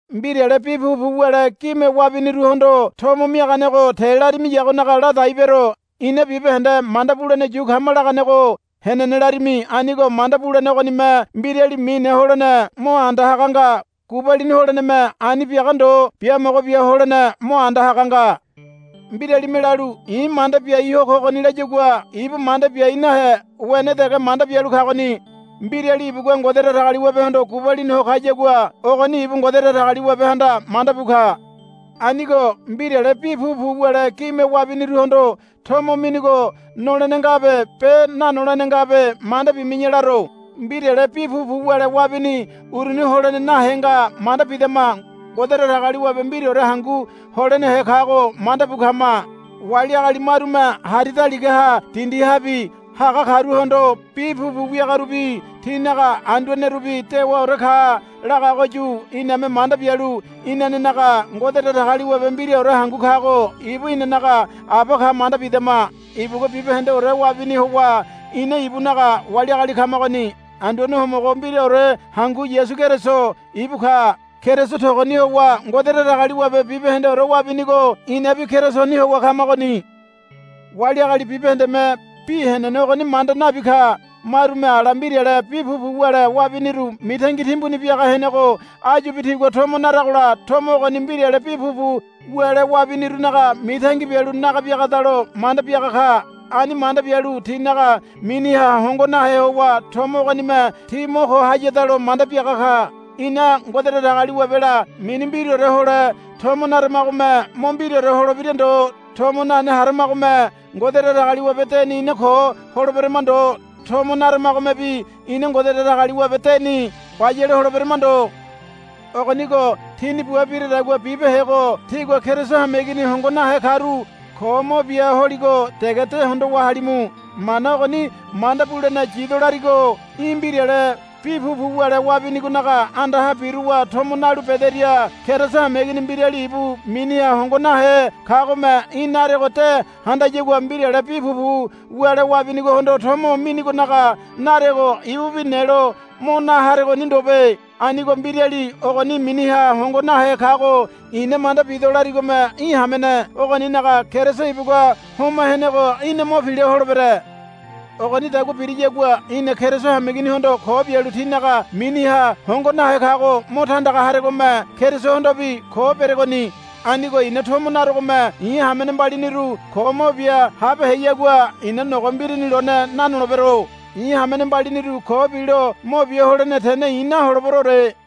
Mbirale bi pupu wule gime wabiniruhondo tomo miaganego te larimiyagonaga ladai bero. Ina bibahende manda bulene yu kama laganego henene larimi. Anigo manda bulene ogonime mbirali mine holene mo anda haga nga. Gubalini holeneme ani biaga ndo biamogo bia holene mo anda haga nga. Mbiralime lalu, I̱ manda biai ho kogoni, layagua ibu manda biai nahe wene dege manda bialu kagoni. Mbirali ibugua Ngode Datagaliwabehondo gubalini ho kayagua ogoni ibu Ngode Datagaliwabehanda manda bu ka. Anigo mbirale bi pupu wule gime wabiniruhondo tomo minigo nolene ngabe be nanolene ngabe manda bimi̱ya laro. Mbirale bi pupu wule wabini uruni holene nahe nga manda bidama. Ngode Datagaliwabe mbiraore hangu holenehe kago manda bu kama. Wali agali marume hari daligaha dindihabi haga karuhondo bi pupu wiagarubi tinaga anduanerubi dewaore ka lagagoyu iname manda bialu inanenaga Ngode Datagaliwabe mbiraore hangu kago ibu inanaga Aba ka manda bidama. Ibugua bibahendeore wabini howa ina ibunaga wali agali kamagoni. Anduane Homogo mbiraore hangu Yasu Keriso ibu ka. Keriso togoni howa Ngode Datagaliwabe bibahendeore wabinigo inabi Kerisoni howa kamagoni. Wali agali bibahendeme bi henene ogoni manda nabi ka. Marume ala mbirale bi pupu wule wabiniru mitangi timbuni biaga henego áyubi tigua tomo naragola tomo ogoni mbirale bi pupu wule wabinirunaga mitangi bialu naga biagadalo manda biaga ka. Ani manda bialu tinaga miniha hongo nahe howa tomo ogonime ti mo ko hayadalo manda biaga ka. Ina Ngode Datagaliwabela mini mbiraore hole tomo naramagome mo mbiraore holebira ndo. Tomo nane haramagome Ngode Datagaliwabe deni ina ko holeberama ndo. Tomo naramagomebi ina Ngode Datagaliwabe deni bayale holeberama ndo. Ogonigo tíni bua biradagua bibehego tígua Keriso hameigini hongo nahe karu ko mo bia holigo dege de hondowa halimu. Mana ogoni manda bulene yido larigo í̠ mbirale bi pupu wule wabinigonaga andaha biruwa tomo nalu bederia Keriso hameigini mbirali ibu miniha hongo nahe kagome í̠ narego de handayagua mbirale bi pupu wule wabinigohondo tomo minigonaga narego ibubi nelo mo na haregoni ndobe. Anigo mbirali ogoni miniha hongo nahe kago i̱na manda bido larigome í̠ hamene ogoninaga Keriso ibugua homa henego í̠na mo pila holebere. Ogonidagua biriyagua í̠na Keriso hameiginihondo ko bialu tinaga miniha hongo nahe kago mo tandaga haregome Kerisohondobi ko beregoni. Anigo i̱na tomo narogome i̱ hamene mbaliniru ko mo bia habeheyagua i̱na nogo mbirini lone nanolebero. I̱ hamene mbaliniru ko bilo mo bia holene tene i̱ naholeberoore.